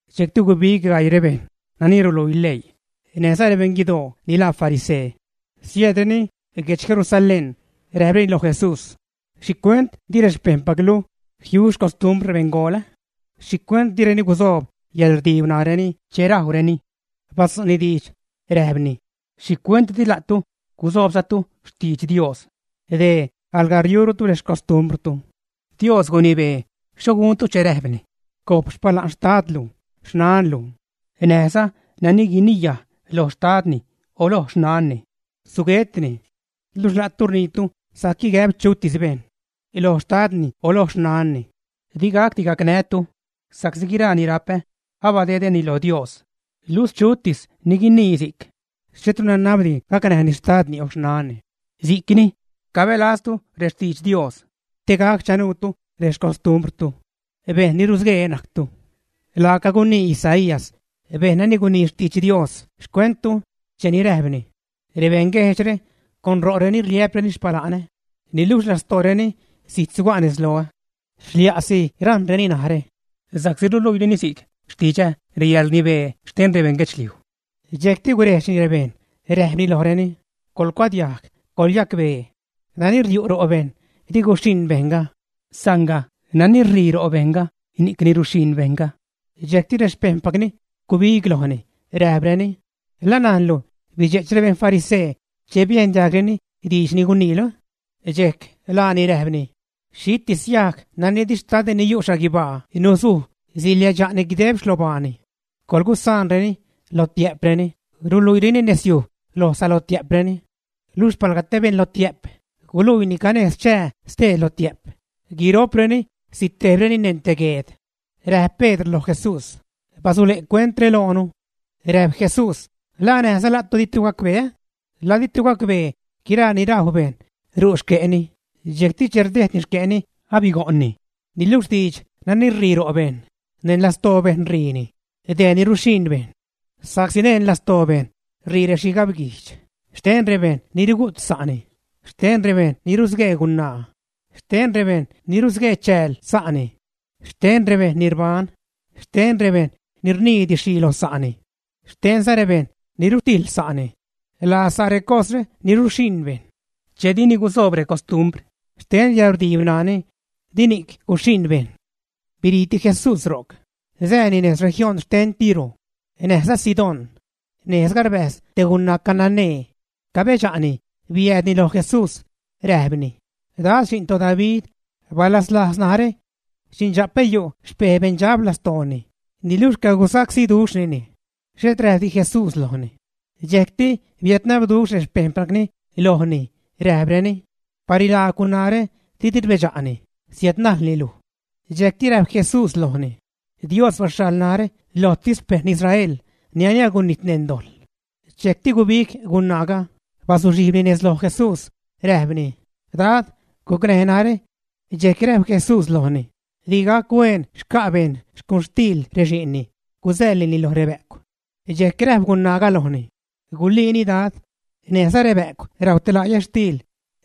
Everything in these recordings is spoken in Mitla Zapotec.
Dxejcti gubig gaii rebejṉ nani ruluii leii näjza rebejṉ guidoo ni laa farisee. Siäädreni guedx Jerusalén, räjpreni loj Jesús: ―¿Xhicuent di rexpejṉpaclu jiu xcostrumbr rebeṉgool? ¿Xhicuent direni gusoob yäḻrdiib ṉaareni che rajwreni? Badzu'ni diidx, räjpni: ―¿Xhicuent di la'tu gusoobzatu xtidx Dios? Dee alga riurutu rexcostumbrtu. Dios gunibeeni xho guntu che räjpni: “Gojp xpala'n xtadlu, xnanlu”, näjza “Nani guiniyaj lo xtadni o loj xnanni, suguetni.” Luxh la'tu rniitu sajc gäb chutis bejṉ loj xtadni o loj xnanni: “Digacdi gacnää́tu sa'csi guiraa ni rapä abadedäni lo Dios.” Luxh chutis ni guinii si'c, xhetru nanabdi gacnäjni xtadni o xnani. Si'c ni cabälaztu rextidx Dios te gac chanuutu rexcostumbrtu. ¡Bejṉ ni rusguee najctu! Laaca gunii Isaías, bejṉ nani gunii xtidx Dios xcuenttu cheni räjpni: Rebeṉguejdxre con ro'reni rliä'preni xpala'nä niluxh lastooreni zijt suga' nez loä. Xlia'si rajṉreni narä, sa'csi ruluiireni si'c xtidxä reyäḻrnibee xten rebeṉ guedxliuj. Dxejcti gurejdxni rebejṉ, räjpni lojreni: ―Coḻcuadiajg, coḻyacbee. Nani riu' ro' bejṉ di guxhiṉ bejṉga, sanga nani ṟii ro' bejṉga ni'cni ruxhiṉ bejṉga. Dxejcti rexpejṉpacni gubig lojni, räjpreni: ―¿La najnlu bidxe'ch rebejṉ farisee che biejn diajgreni diidx ni guniilu? Dxejc laani räjpni: ―Xhitis yajg nani di Xtadä ni yu' xhaguibaa nusuj siliädxa'ni guideb xlobaani. Coḻgusaanreni; lotiä'preni, ruluiireni nezyuj lo salotiä'preni. Luxh palga te beṉ lotiä'p guluii canejz chää stee lotiä'p, guiro'preni sitejbreni neṉ te gueed. Räjp Pedr loj Jesús: ―Basule' cuentre loonu. Räjp Jesús: ―¿La näjza la'tu ditu gacbee, ä? ¿La ditu gacbee guiraa ni rajw bejṉ ru' xque'ni, dxejcti che rdejdni xque'ni, abigo'ṉni? Niluxh diidx nani ṟii ro' bejṉ, neṉ lastoo bejṉ ṟiini; dee ni ruxhiṉ bejṉ. Sa'csi neṉ lastoo bejṉ ṟii rexhigabguijdx xten rebejṉ ni rugu't sa'ni; xten rebejṉ ni rusguee gunaa; xten rebejṉ ni rusguee chääl sa'ni; xten rebejṉ ni rbajn; xten rebejṉ ni rnii didxxhii lo sa'ni; xtenza rebejṉ ni rutijḻ sa'ni. Laa sa' recosre ni ruxhiṉ bejṉ. Che dini gusoob recostumbr xte yäḻrdiib ṉaani, di ni'c guxhiṉ bejṉ. Biriiti Jesús ro'c, sääni nez región xten Tiro näjza Sidón. Nejzga rbäjz te gunaa cananee, cabedxa'ni biäädni lo Jesús, räjpni: ―Dad, xi'n toDavid, balaslajz narä. Xindxa'pä yu' xpej beṉdxab lastooni, niluxh cagusacsíduxhnini. Xhet räjpdi Jesús lojni. Dxejcti biädnabduxh rexpejṉpacni lojni, räjpreni: ―Barilaagw gunaare, didi rbedxa'ni siädnajlni luj. Dxejcti räjp Jesús lojni: ―Dios baxhaḻ narä lojtis xpeṉ Israel nani agunijt neṉ dojḻ. Dxejcti gubig gunaaga, bazuxhijbni nez loj Jesús, räjpni: ―Dad, gucnäj narä. Dxejc räjp Jesús lojni: ―Di gac hueen xca' bejṉ xcuxtiil rexi'nni gusäḻnini lo rebä'cw. Dxejc räjp gunaaga lojni: ―Guliini Dad, näjza rebä'cw rajw te la' yätxtiil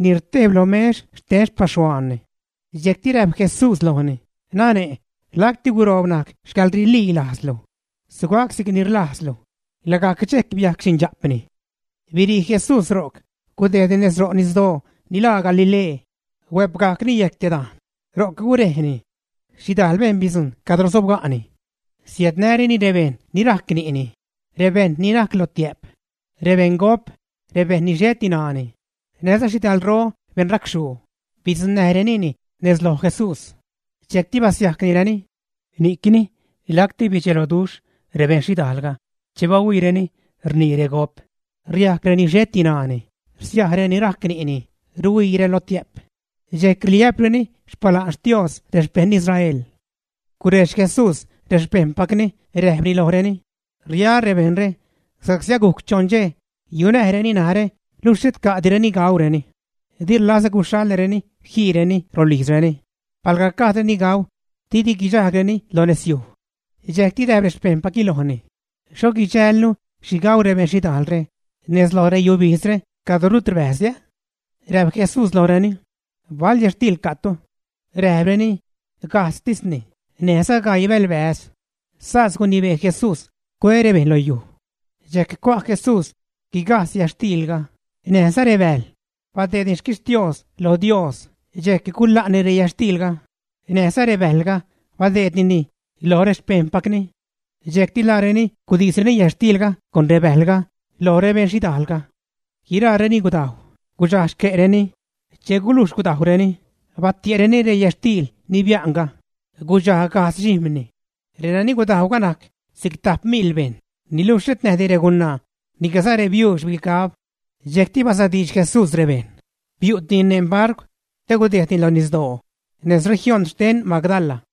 ni rtejb lo mex xten xpaxhuaanni. Dxejcti räjp Jesús lojni: ―Nane', lacti guroob najc xcäḻrililajzlu. Sugac si'cni rlajzlu. Lagajc dxejc biajc xindxa'pni. Birii Jesús ro'c gudejdni nez ro' nisdoo ni laa Galilee. Huäpgajcni yejc te dajn, ro'c gurejni. Xhidajl bejṉ bidzujṉ cad sobga'ni. Siädnäreni rebeṉ ni rajc ni'ni, rebeṉ ni najc lotiä'p, rebeṉ gop, rebeṉ ni xheti ṉaani, näjza xhidalro beṉ racxhuu, bidzuṉnäjrenini nez loj Jesús. Dxejcti basiajcnireni. Ni'cni lacti bidxeloduxh rebeṉ xhidajlga che bahuiireni rnii regop, riajc reni xheti ṉaani, rsiaj reni rajc ni'ni, ruhuii relotiä'p, dxejc rliä'preni xpala'n Xtios rexpeṉ Israel. Gurejdx Jesús rexpejṉpacni räjpni lojreni: ―Riaä́ rebejṉre sa'csi agujc choṉ dxej yunäjreni narä luxh xhet ca'direni gaureni. Di rlazä guxhaḻäreni jiireni rolijzreni palga gajdreni gau didi guidxajgreni lo nezyuj. Dxejcti räjp rexpejṉpacni lojni: ―¿Xho guidxälnu xhi gau rebeṉ xhidajlre nez lo reyubijzre cadro rut rbäjzdi, ä? Räjp Jesús lojreni: ―¿Bal yätxtiil ca'tu? Räjpreni: ―Gajdztisni, näjza gaii bälbäze'. Sas gunibee Jesús cue rebejṉ lo yuj. Dxejc cua' Jesús guigajdz yätxtiilga näjza rebäjl, badeedni xquixtios lo Dios dxejc gula'ni reyätxtiilga näjza rebäjlga badeednireni loj rexpejṉpacni. Dxejcti laareni gudisreni yätxtiilga con rebäjlga lo rebejṉ xhidajlga. Guiraareni gudajw, gudxaj xque'reni. Che gulujx gudajwreni, batie'reni reyätxtiil ni bia'nga, gudxaj gajdz dxijm̲ni. Renani gudajwga najc si'cti tajp miḻ bejṉ, niluxh xhet näjdi regunaa niclaza rebiuux bigab. Dxejcti basadiidx Jesús rebejṉ, biu'tini neṉ barcw te gudejdni lo nisdoo nez región xten Magdala.